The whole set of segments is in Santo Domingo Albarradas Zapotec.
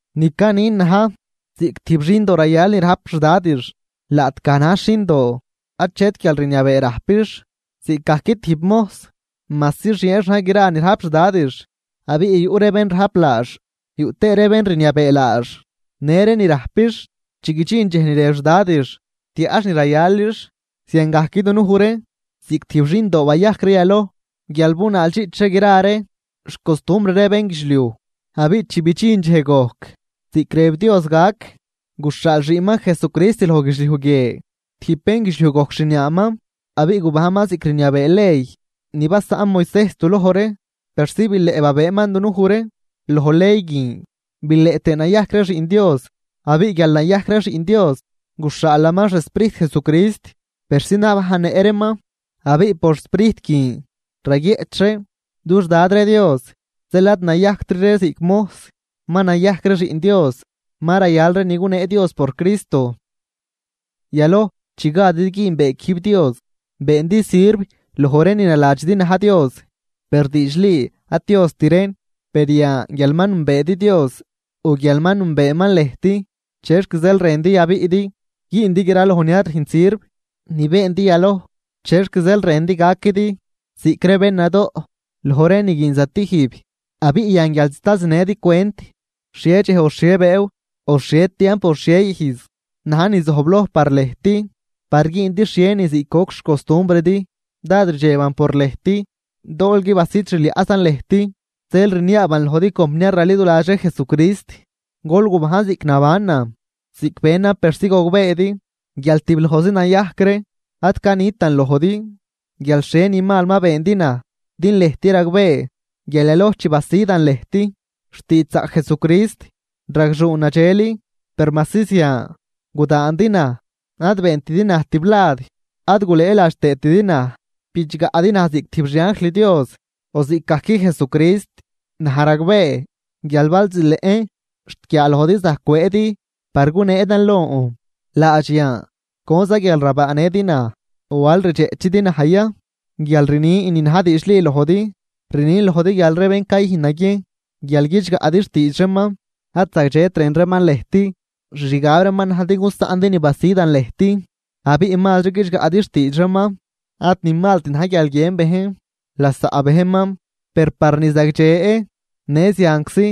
Ni canin na̱j: Ziꞌc tijb xindo rayal ni rajp xdadix, laꞌtgaj najx xindoo achet guialrniabee rajpix, ziꞌcgajc tijb mojs, majsi xieenx na̱j gra ni rajp xdadix. Abiꞌ yuꞌ ree bén rajp laax yuꞌ tëë ree bén rniabee laax në ree ni rajpix, xt chi guidxin dxej ni rëb xdadix tiaꞌx ni rayalix. Ziangajc dunuj ree, ziꞌc tijb xindoo bayajc ree yaloj guial bunaaldxiꞌch ree gra ree xcostumbr ree bénguidxliuj. Abiꞌ chi bidxin dxej gojc ziꞌc rëb Dios gac, guxhaal xiꞌnman Jesucrist loj guidxliuj guie, tijb bénguidxliuj gojc xniaaman. Abiꞌ gubajnman ziꞌc rniabee ley ni basaꞌn Moisejs duloj ree persi bileꞌ babëëman dunuj ree loj ley guin bileꞌ tëë nayajc ree Xiꞌn Dios. Abiꞌ guial nayajc ree xiꞌn Dios, guxhaalaman xSprijt Jesucrist persi nabajnnëꞌ reeman, abiꞌ por Sprijt guin raguieꞌch ree: “¡Dux Dad ree Dios!” Zeel ad nayajctri ree ziꞌc mojs, ma nayajc ree xiꞌn Dios, ma rayal ree ni gunee Dios por Cristo. Yaloj chi gadidi güünbee quijb Dios, beendi sirv loj ree ni naladxidi na̱j Dios, per diidxli ad Diost reen. Per yan guial ma nünbeedi Dios o guial ma nünbeeman lëjt, ¿chexc zeel rëndi yabiꞌdi güündi graloj ni ad rüjnt sirv ni beendi yaloj? ¿Chexc zeel rëndi gaquidi ziꞌc bén nadoꞌ loj ree ni guin ree zatijb? Abiꞌ yan guial sta zinëdi cwent xhie dxej o xhie bëëw o xhie tiamp o xhie ijz na̱j ni zojbloj par lëjt par güündi xhienin ziꞌc goc xcostumbridi. Dád rdxeban por lëjt, doolgui basid xliaꞌzan lëjt. Zeel rniaaban lojdi compniar raliduladx ree Jesucrist, gol gubajn ziꞌc nabanan, ziꞌc benan persi gogbeedi guial tiblojzi nayajc ree. Ad canitan lojdi guial xhie ni mal ma beendi naj din lëjt ragbee guial yaloj chi basidan lëjt xtiidxzaꞌc Jesucrist, ragxuun nadxel. Per majsi zian, gudaandi naj. Ad beentidi naj tiblad ad gulëëladx tëëtidi naj, bidxgaꞌdi naj ziꞌc tijb xianjl Dios o ziꞌcgajc Jesucrist. Naj ragbee guial bal zileꞌn xt guiaalojdi zajc cwëëdi par guneedan lon. Laadx yan, ¿conzan guial rabaanëdi naj? ¿O al rdxeꞌchidi naj ya guial rnin ni na̱j diidxli lojdi? Rnin lojdi guial ree bén cayüjn naguiejn guial guidxgaꞌdi xtiidx reeman, ad zagdxet rën reeman lëjt, xixgab reeman na̱j din gusaꞌndi ni basidan lëjt abiꞌ mazri guidxgaꞌdi xtiidx reeman. Ad ni malt na̱j guial guiën bejn lasaꞌ bejnman, per par ni zagdxe në zianczi,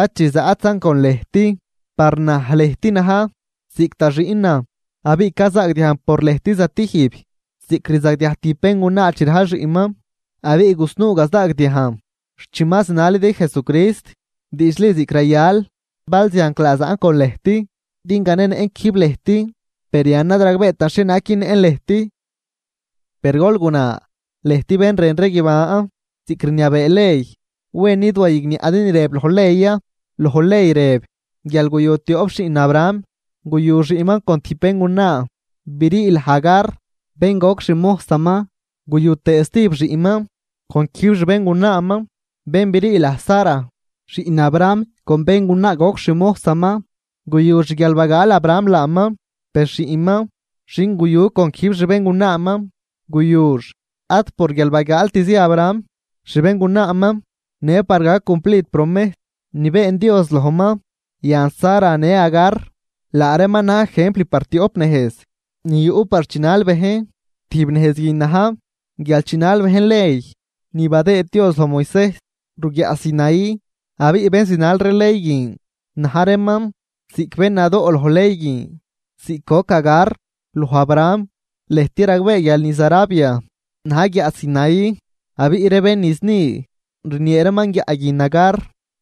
ad chi zaꞌtzan con lëjt. Par naj lëjt na̱j ziꞌc da xiꞌnan. Abiꞌ cazaagdiajn por lëjt zatijb, ziꞌc rzagdiaj tijb béngunaa chi rajl xiꞌnman. Abiꞌ gusnuu gazaagdiajn xt chi ma zinalidi Jesucrist diidxli ziꞌc rayal. ¡Bal zianclaa zaꞌn con lëjt din ganenëꞌn quijb lëjt, per yan ad ragbeetan xhienaag günnëꞌn lëjt! Per gol guna, lëjt bén rën ree guiban ziꞌc rniabee ley. ¿Wen id wayigniaꞌdi ni rëb loj ley ya? Loj ley rëb guial guyu tioꞌp xiꞌn Abraham: Guyu xiꞌnman con tijb béngunaa brii laj Agar bén goc xmojsaman, guyu tëë stijb xiꞌnman con quijb xbéngunaaman bén brii laj Sara. Xiꞌn Abraham con béngunaa goc xmojsaman, guyux guial bagaal Abraham laaman. Per xiꞌnman xin guyu con quijb xbéngunaaman guyux ad por guial bagaaltzi Abraham xbéngunaaman, në par gac cumplid promejs ni been Dios lojman. Yan, Sara në Agar laa reeman na̱j ejempl por tioꞌp nejz ni yuꞌ par chinal bejn. Tijb nejz guin na̱j guial chinal bejn ley ni badëëd Dios loj Moisejs ruguiaꞌ Sinaí, abiꞌ bén zinal ree ley guin na̱j reeman ziꞌc bén nadoꞌ loj ley guin ziꞌc goc Agar loj Abraham. Lëjt ragbee guial niz Arabia na̱j guiaꞌ Sinaí, abiꞌ ree bén niz ni rniee reeman guiaꞌ guin Agar.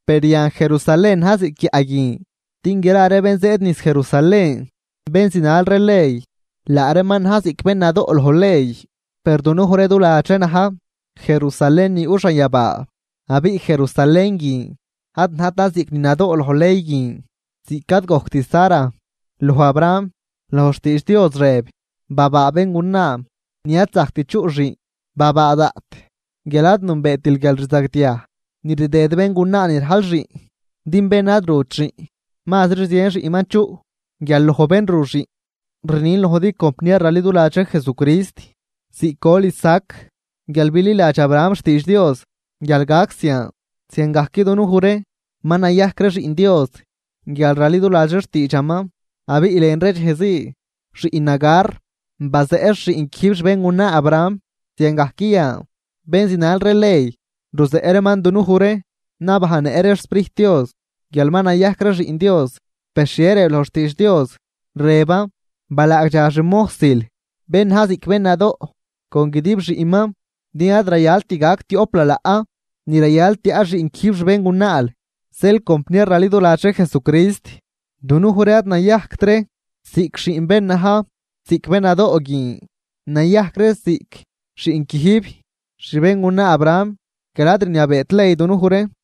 Per yan Jerusalén na̱j ziꞌc guiaꞌ guin, din gra ree bén zëëd niz Jerusalén, bén zinal ree ley, laa reeman na̱j ziꞌc bén nadoꞌ loj ley. Per dunuj ree du ladx ree na̱j Jerusalén ni yuꞌ xanyabaa abiꞌ Jerusalén guin ad najtan ziꞌc ni nadoꞌ loj ley guin ziꞌc ad gojct Sara loj Abraham. Loj xtiidx Dios rëb: Babaa béngunaa ni ad zajct chuꞌ xiꞌn. Babaa daꞌt guial ad nünbeetil guialrzagdiaj ni rdëd béngunaa ni rajl xiꞌn. Din bén ad rut xiꞌn, mazri zien xiꞌnman chuꞌ guial loj bén ru xiꞌn. Rnin lojdi compniar raliduladx ree Jesucrist, ziꞌc gol Isaac guial bililadx Abraham xtiidx Dios guial gac zian, ziangajc dunuj ree ma nayajc ree xiꞌn Dios guial raliduladx ree xtiidxaman. Abiꞌ lën ree dxejzii, xiꞌn Agar bazeꞌx xiꞌn quijb xbéngunaa Abraham, ziangajc yan bén zinal ree ley ruzeꞌ reeman dunuj ree nabajnnëꞌ ree xSprijt Dios, guial ma nayajc ree xiꞌn Dios, Per, ¿xhie rëb loj xtiidx Dios? Rëban: “Balaagdxa xmojsil con guidib xiꞌnman, din ad rayalt gac tioꞌp lalaꞌ ni rayal tiaꞌ xiꞌn quijb xbéngunaal.” Zeel compniar raliduladx ree Jesucrist, dunuj ree ad nayajct ree ziꞌc xiꞌn bén na̱j ziꞌc bén nadoꞌ guin, nayajc ree ziꞌc xiꞌn quijb xbéngunaa Abraham guial ad rniabeet ley dunuj ree.